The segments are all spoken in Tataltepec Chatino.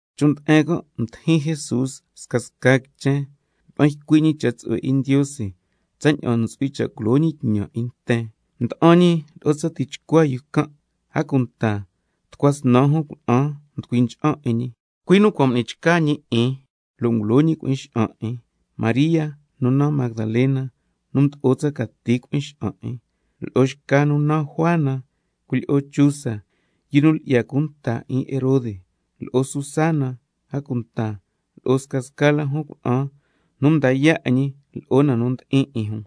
Chon' nde'en can' mdijin Jesús scasca quichen, mda'an ycui' ñi cha' tsu'hue 'in Ndiose tsaña'an ntsu'hui cha' culo ñi tñan 'in nten, mda'an ñi lo'o tsa tichcua yu can'. A cunta lo'o tucua snan jun cuna'an nducui ncha'an 'in ñi, cui' nu cua' m'ni chca ñi 'in lo' ngulo ñi cui'in xa'an 'in: María nu naan Magdalena, nu mdo'o tsa cati cui'in xa'an 'in, lo'o xca nu naan Juana, cuilyi'o yu Chuza, yu nu lyi'ya cunta tñan 'in Herode, lo'o Susana, a cunta lo'o scasca la jun cuna'an nu nda yaa' 'in ñi lo'o na nu ndi'in 'in jun.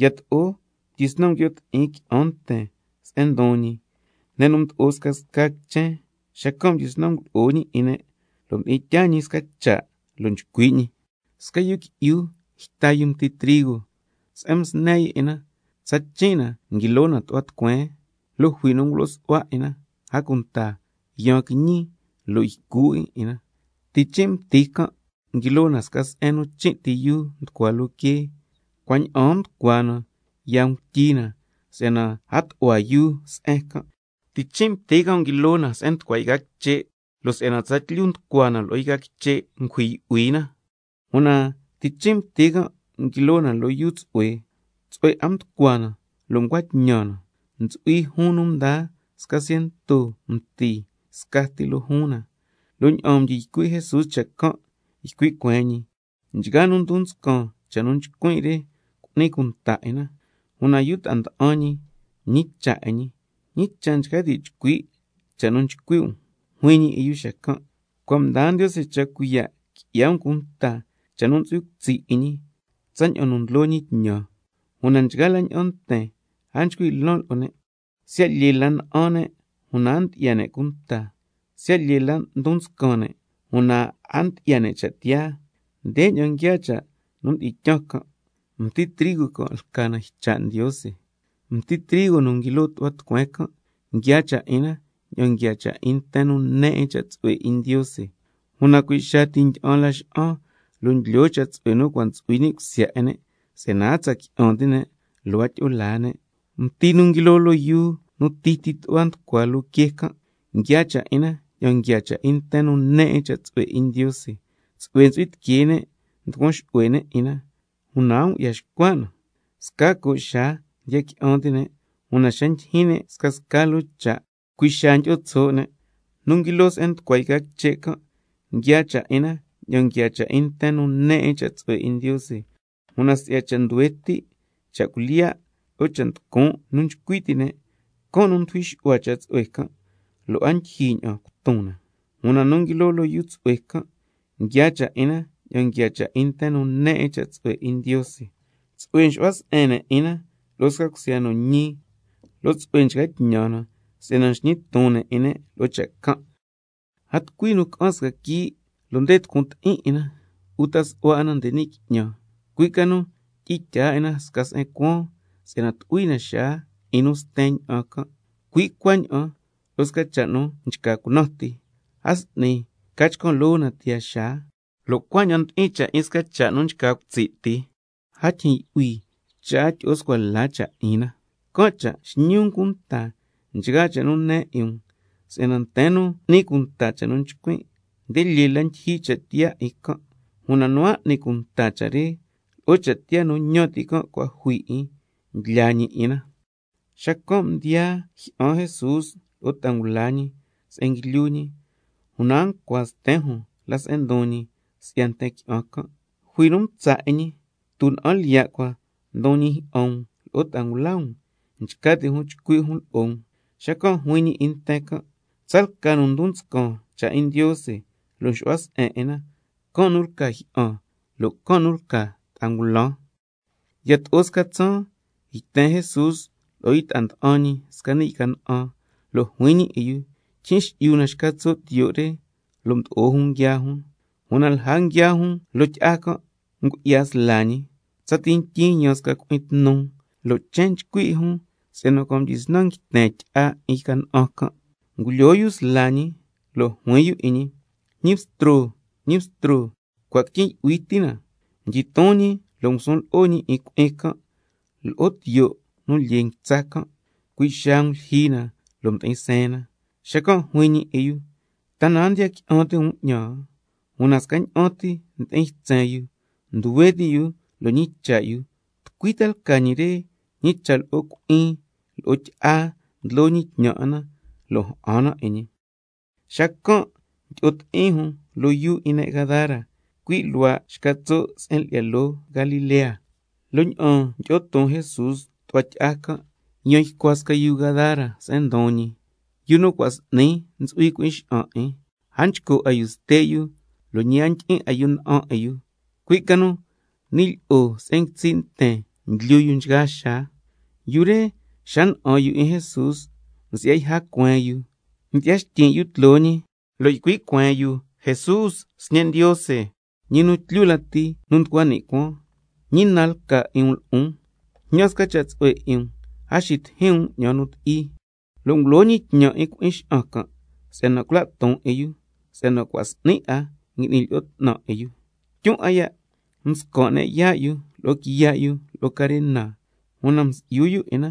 Yato'o mdyisnan nguio' ti'in qui'an nten se'en ndon ñi, ne' nu mdo'o scasca quichen, xacan' mdyisnan ngulo'o ñi 'in ne', lo' mdi'in tyaa ñi sca cha' lo' nchcui' ñi: Sca yu qui'yu yta mti trigo, se'en msne yu 'in na tsachin' na nguilo na tu'hua tucueen, lo' jui nu ngulo su'hua 'in na, a cunta yaan quiñi lo' ycu 'in na. Tichin' mti can' nguilo na sca se'en nu chin' ti yuu nducua loo quee, cua' ña'aan nducua na yaa nguityi na si'yana a tu'hua yuu se'en can'. Tichin' mti can' nguilo na se'en nducua yca quiche', lo' si'yana tsatlyu nducua na lo'o yca quiche', can' cha' ngujui yu'hui na. Una tichin' mti can' nguilo na loo yuu tsu'hue, tsu'hue 'a mducua na lo' ncua tñan na, ntsu'hui juun nu mdaa sca ciento mti scati loo juun na. Lo' ña'aan mdyi ycui' Jesús cha' can', ycui' cueen ñi: Nchgaa nu ndon nscan cha' nu ycuin' re cu'ni cunta 'in na. Una yu ta'a nda'an ñi mñicha' 'in ñi: ¿Ñi cha' nchca ti' chcui' cha' nu ycui' um? Juin ñi 'in yu xacan': Cua' mdaa Ndiose cha' cuiya' qui'ya um cunta cha' nu ntsu'hui cutsi' 'in ñi tsaña'an nu ndlo ñi tñan. Una nchgaa la ña'an nten a nchcui' lan lo'o ne', —siya' lyee la ña'an ne' una a ndyi'ya ne' cunta, siya' lyee la ndon nscan ne' una a ndyi'ya ne' cha' tiyaa—. Ndeña'an nguiaa cha' nu mdi'in tyaan can': Mti trigo can' lca na ycha' Ndiose. Mti trigo nu nguilo tu'hua tucueen can', nguiaa cha' 'in na tsaña'an nguiaa cha' 'in nten nu ne 'in cha' tsu'hue 'in Ndiose, una cui' xaa ti ndyi'an laxa'an lo' ndlyoo cha' tsu'hue nu cua' ntsu'hui ni' cusya 'in ne', ña'an ca si'yana a tsa qui'an ti' ne' lo' a tyi'o laa ne'. Mti nu nguilo loo yuu nu titi tu'hua nducua loo quee can', nguiaa cha' 'in na tsaña'an nguiaa cha' 'in nten nu ne 'in cha' tsu'hue 'in Ndiose, tsu'hue ntsu'hui tiquee ne' nducuan xu'hue ne' 'in na, una a ngu'ya xcua' na. Sca co' xaa ndiya qui'an ti' ne', una xa ndyijyin ne' scasca loo cha', cui' xaa ndyi'o tso' ne'. Nu nguilo se'en nducua yca quiche' can', nguiaa cha' 'in na tsaña'an nguiaa cha' 'in nten nu ne 'in cha' tsu'hue 'in Ndiose, una si'ya cha' nduhue ti', ta cha' cuilyiya' lo'o scasca cha' nducun' nu nchcui ti' ne', can' nu ndujui xu'hua cha' tsu'hue can', lo' a ndyijyi 'a ña'an cuton na. Una nu nguilo loo yuu tsu'hue can', nguiaa cha' 'in na tsaña'an nguiaa cha' 'in nten nu ne 'in cha' tsu'hue 'in Ndiose, tsu'hue nxu'hua se'en ne' 'in na lo'o sca cusya nu ñi, lo' tsu'hue nchca tñan na si'yana nxñi ton ne' 'in ne' loo cha' can'. A tucui nu ca'an sca quii' lo' nde tucun ti'in 'in na, uta su'hua 'in na nde ni' qui'ñan, cui' ca nu tyi'in tyaa 'in na sca se'en cuaan, si'yana tu'hui na xaa 'in nu sten ña'an can'. Cui' cuaña'an lo'o sca cha' nu nchca cunan ti, a s'ni ca chcan' loo na tiyaa xaa, lo' cuaña'an ndi'in cha' 'in sca cha' nu nchca cutsi' ti, a tyijyin yu'hui cha' a tyi'o scua la cha' 'in na. Can' cha' xñi um cunta nchgaa cha' nu ne 'in um, si'yana nten nu n'ni cunta cha' nu nchcuin', nde lyee la ndyijyi cha' tiyaa 'in can', una nu a n'ni cunta cha' re, lo'o cha' tiyaa nu ñan ti' cua' jui 'in, ndlyaa ñi 'in na. Xacan' mdiyaa jyi'an Jesús lo'o ta'a ngula ñi se'en nguilyu ñi, una a ncua sten jun la se'en ndon ñi si'ya nten qui'an can'. Jui nu mtsa' 'in ñi: Tuna'an lyiya' cua ndon ñi jyi'an um lo'o ta'a ngula um, nchca ti' jun chcui' jun lo'o um. Xacan' juin ñi 'in nten can': Tsalca nu ndon nscan cha' 'in Ndiose lo' nxu'hua se'en 'in na, can' nu lca jyi'an nan' lo' can' nu lca ta'a ngulan. Yato'o sca tsaan yten Jesús lo'o yu ta'a nda'an ñi sca ni' yca na'an, lo' juin ñi 'in yu: Tyijyin xi'yu na xca tso' tiyo' re. Lo' mdo'o jun nguiaa jun. Una lja nguiaa jun loo tyi'a can' ngu'ya sla ñi. Tsati ntyin yaan sca cui'in tnu, lo' chen nchcui 'in jun si'yana cua' mdyisnan nguiten tyi'a 'in yca na'an can'. Ngulyoo yu sla ñi, lo' juin yu 'in ñi: Ñi Bstro, Ñi Bstro, cua' quityin' yu'hui ti na. Xacan' mdyiton ñi lo' ngusun lo'o ñi 'in cui'in can' lo'o tiyo' nu lyee nguitsa can', cui' xaa ngulyijyi na lo' mdi'in seen na. Xacan' juin ñi 'in yu: ¿Ta na a ndiya qui'an ti' um 'ñan? Una scaña'an ti ndi'in ytsen yu, nduhue ti' yu lo' ñicha' ta'a yu: ¿Tucui ta lca ñi re, ñi cha' lo'o cui'in lo'o tyi'a ndlo ñi tñan 'in na, lo' ja'an na 'in ñi? Xacan' mdyi'o ti'in jun loo yuu 'in ne' Gadara, cui' luhua' xca tso' se'en lyi'ya loo Galilea. Lo' ña'aan mdyi'o ton Jesús tu'hua tyi'a can', yan ycua sca yu Gadara se'en ndon ñi, yu nu cua' s'ni 'a ntsu'hui cui'in xa'an 'in, a nchco' 'a yu ste' yu, a cunta a ndyi'in 'a yu ña'an 'in yu, cui' ca nu ni' lyi'o se'en nguitsi' nten ndlyu yu nchgaa xaa. Yu re xa na'an yu 'in Jesús, msi'ya yja cueen yu, mdyi'ya xtyin' yu tloo ñi, lo' ycui' cueen yu: Jesús, Sñe' Ndiose, ñi nu tlyu lati nu nducua ni' cuaan, ¿ñi na lca 'in um lo'on? Jñan sca cha' tsu'hue 'in um a xitijin um 'ñan nu ti'i. (Lo' mdyisnan ngulo ñi tñan 'in cui'in xa'an can' si'yana cula' ton 'in yu, si'yana cua' s'ni 'a ngui'ni lyi'o 'tnan cui'in xa'an can' 'in yu. Tyun 'a ya' mscan' ne' yaa' yu lo'o quiya' yu lo'o carena, una msi'yu yu 'in na,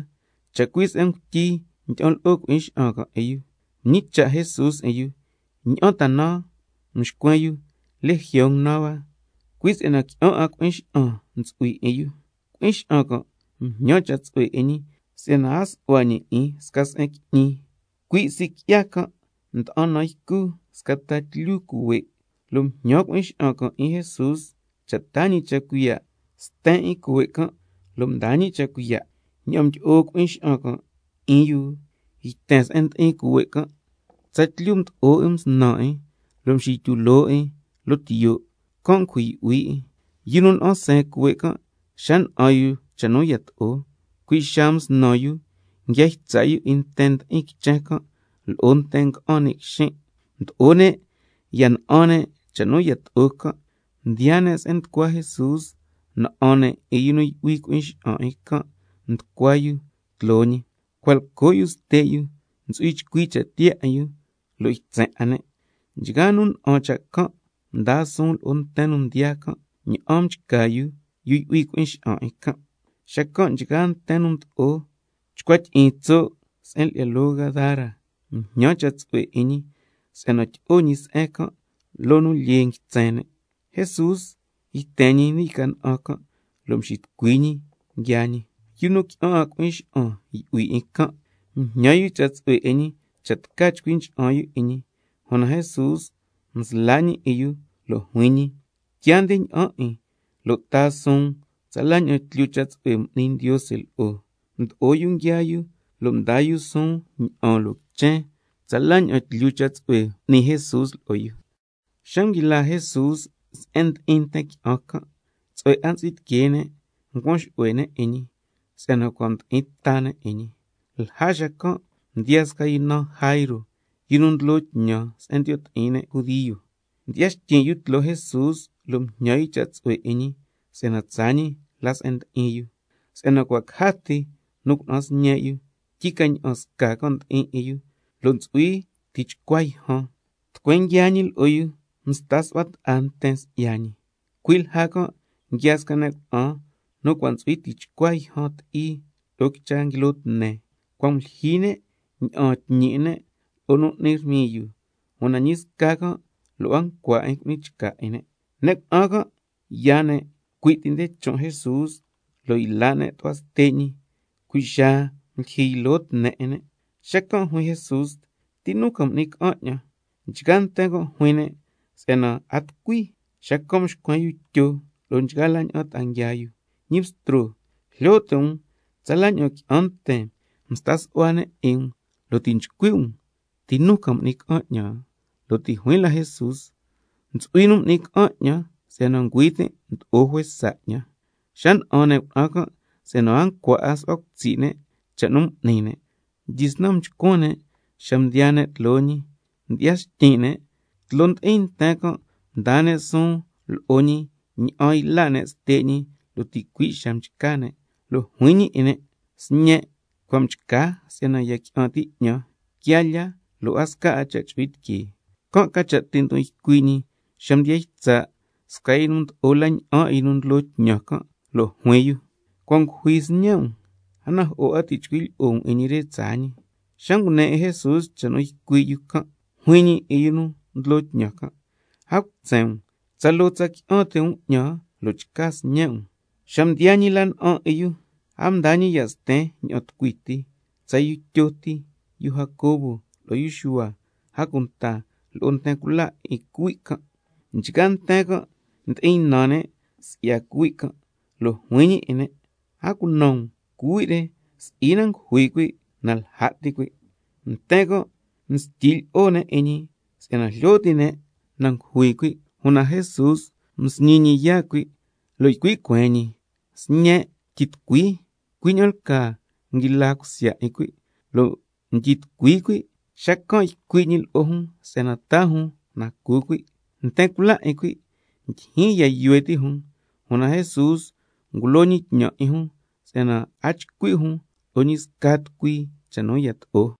chacui' se'en ngutyi ndyi'an lo'o cui'in xa'an can' 'in yu.) Mñicha' Jesús 'in yu: ¿Ña'an ta naan? Xacan' mxcuen yu: Legión naan hua. Cui' si'yana qui'an 'a cui'in xa'an ntsu'hui 'in yu. Cui'in xa'an can' mjñan cha' tsu'hue 'in ñi si'yana a su'hua ñi 'in sca se'en qui'ñi. Cui' sii' qui'ya can' nda'an nan ycu sca ta tlyu cuhue', lo' mjñan cui'in xa'an can' 'in Jesús cha' taa ñi cha' cuiya' sten 'in cuhue' can', lo' mdaa ñi cha' cuiya'. Ña'aan mdyi'o cui'in xa'an can' 'in yu yten se'en ndi'in cuhue' can', tsatlyu mdo'o 'in msnan 'in, lo' mxityu loo 'in loo tiyo', can' ngujui yu'hui 'in. Yu nu na'an seen cuhue' can', xa na'an yu cha' nu yato'o, cui' xaa msnan yu nguia ytsa' yu 'in nten ndi'in quichen can' lo'o nten nga'an ni' quixin'. Mdo'o ne' ya na'an ne' cha' nu yato'o can', mdiyaa ne' se'en nducua Jesús, na'an ne' 'in yu nu yu'hui cui'in xa'an 'in nducua yu tloo ñi, cua' lco' yu ste' yu, ntsu'hui chcui cha' tiyaa 'in yu, lo' ytsen 'a ne'. Nchgaa nu na'an cha' can' mdaa suun lo'o nten nu mdiyaa can', ña'an mchca yu nu yu'hui cui'in xa'an 'in can'. Xacan' nchgaa nten nu mdo'o chcua tyi'in tso' se'en lyi'ya loo Gadara, mjñan ne' cha' tsu'hue 'in ñi si'yana tyi'o tso' ñi se'en can' loo nu lyee nguitsen ne'. Jesús yten ñi ni' yca na'an can', lo' mxitucui ñi nguiaa ñi. Yu nu qui'an 'a cui'in xa'an yu'hui 'in can', mjñan yu cha' tsu'hue 'in ñi cha' tca chcui ncha'an yu 'in ñi, una Jesús msla' ñi 'in yu, lo' juin ñi: Quiaa nde ña'an 'in, lo' taa suun tsala ña'an tlyu cha' tsu'hue m'ni Ndiose lo'o. Mdo'o yu nguiaa yu lo' mdaa yu suun ña'aan loo quichen can' tsala ña'an tlyu cha' tsu'hue m'ni Jesús lo'o yu. Xa nguila Jesús se'en ndi'in nten qui'an can', tsu'hue 'a ntsu'hui tiquee ne' ncuan xu'hue ne' 'in ñi, si'yana cua' ndi'in ta ne' 'in ñi. Lja xacan' mdiyaa sca yu naan Jairo, yu nu ndlo tñan se'en ndiyo' ti'in ne' Judio, mdyi'ya xtyin' yu tloo Jesús lo' mjñan yu cha' tsu'hue 'in ñi si'yana tsaa ñi la se'en ndi'in yu, si'yana cua' caja ti nu cuna'an sñe' yu, tyi ca ña'an sca can' ndi'in 'in yu, lo' ntsu'hui tichcua yjan. Tucueen nguiaa ñi lo'o yu msta su'hua ta'a nten si'ya ñi. Cui' lja can' nguiaa sca ne' cuna'an nu cua' ntsu'hui tichcua yjan ti'i lo'o quicha nguilo tne, cua' ngulyijyi ne' ña'aan tñi 'in ne' lo'o nu n'ni rmiyu, una ñi sca can' lo' a ncua 'in cu'ni chca 'in ne'. Ne' cuna'an can' yaan ne' cui' ti nde chon' Jesús lo' yla' ne' tu'hua ste' ñi, cui' xaa ngulyijyi ylo tne 'in ne'. Xacan' juin Jesús: ¿Ti nu ca m'ni ca'an 'ñan? Nchgaa nten can' juin ne' si'yana a tucui, xacan' mxcuen yu Tyo lo'o nchgaa ta'a nguiaa yu: Ñi Bstro, jlyo ti' um tsala ña'an qui'an nten nsta su'hua 'in um, lo' ti' nchcui' um: ¿Ti nu ca m'ni ca'an 'ñan? Lo' ti' juin la Jesús: Ntsu'hui nu m'ni ca'an 'ñan, si'yana ngüi tin' mdo'o juesa 'ñan. Xa na'an ne' cuna'an can' si'yana a ncua su'hua cutsi' ne' cha' nu m'ni ne', mdyisnan mchcuan ne' xa mdiyaa ne' tloo ñi, mdyi'ya xtyin' ne', tloo ndi'in nten can' mdaa ne' suun lo'o ñi ña'an yla' ne' ste' ñi lo' ticui' xaa mchca ne'. Lo' juin ñi 'in ne': Sñen', cua' mchca si'yana ya qui'an ti' 'ñan, quia lya lo' a sca cha' chu'hui tiquee. Can' ca cha' ti' ndon ycui' ñi xa mdiya ytsa' sca yu nu mdo'o la na'an 'in yu nu ndlo tñan can', lo' juin yu: Cua' ngujui sñe' um, a najo'o 'a ti' chcui' um lo'o ñi re tsaa ñi. Xa ngune 'in Jesús cha' nu ycui' yu can', juin ñi 'in yu nu ndlo tñan can': A cutsen um, tsaloo ti tsa qui'an ti' um 'ñan lo' chca sñe' um. Xa mdiyaa ñi la na'an 'in yu, a mdaa ñi ya' sten ña'an nu ti, tsa yu Tyo ti, yu Jacobo lo'o yu Xuhua, a cunta lo'o nten cula 'in cuhui' can'. Nchgaa nten can' ndi'in ynan ne' si'ya cuhui' can', lo' juin ñi 'in ne': A cunan um, cuhui' re si'i na ngujui cuhui', na lja' ti cuhui'. Nten can' mstyi lyi'o ne' 'in ñi, si'yana jlyo ti' ne' na ngujui cuhui'. Una Jesús msñi ñi yaa' cuhui', lo' ycui' cueen ñi: Sñen', tyitucui. Cui' ña'an lcaa nguila cusya 'in cuhui' lo' mdyi tucui cuhui', xacan' ycui' ñi lo'o jun si'yana taa jun na cu cuhui'. Nten cula 'in cuhui' ndyijyin ya' yuhue ti' jun cha' can', una Jesús ngulo ñi tñan 'in jun si'yana a chcui' jun lo'o ñi sca tucui cha' nu yato'o.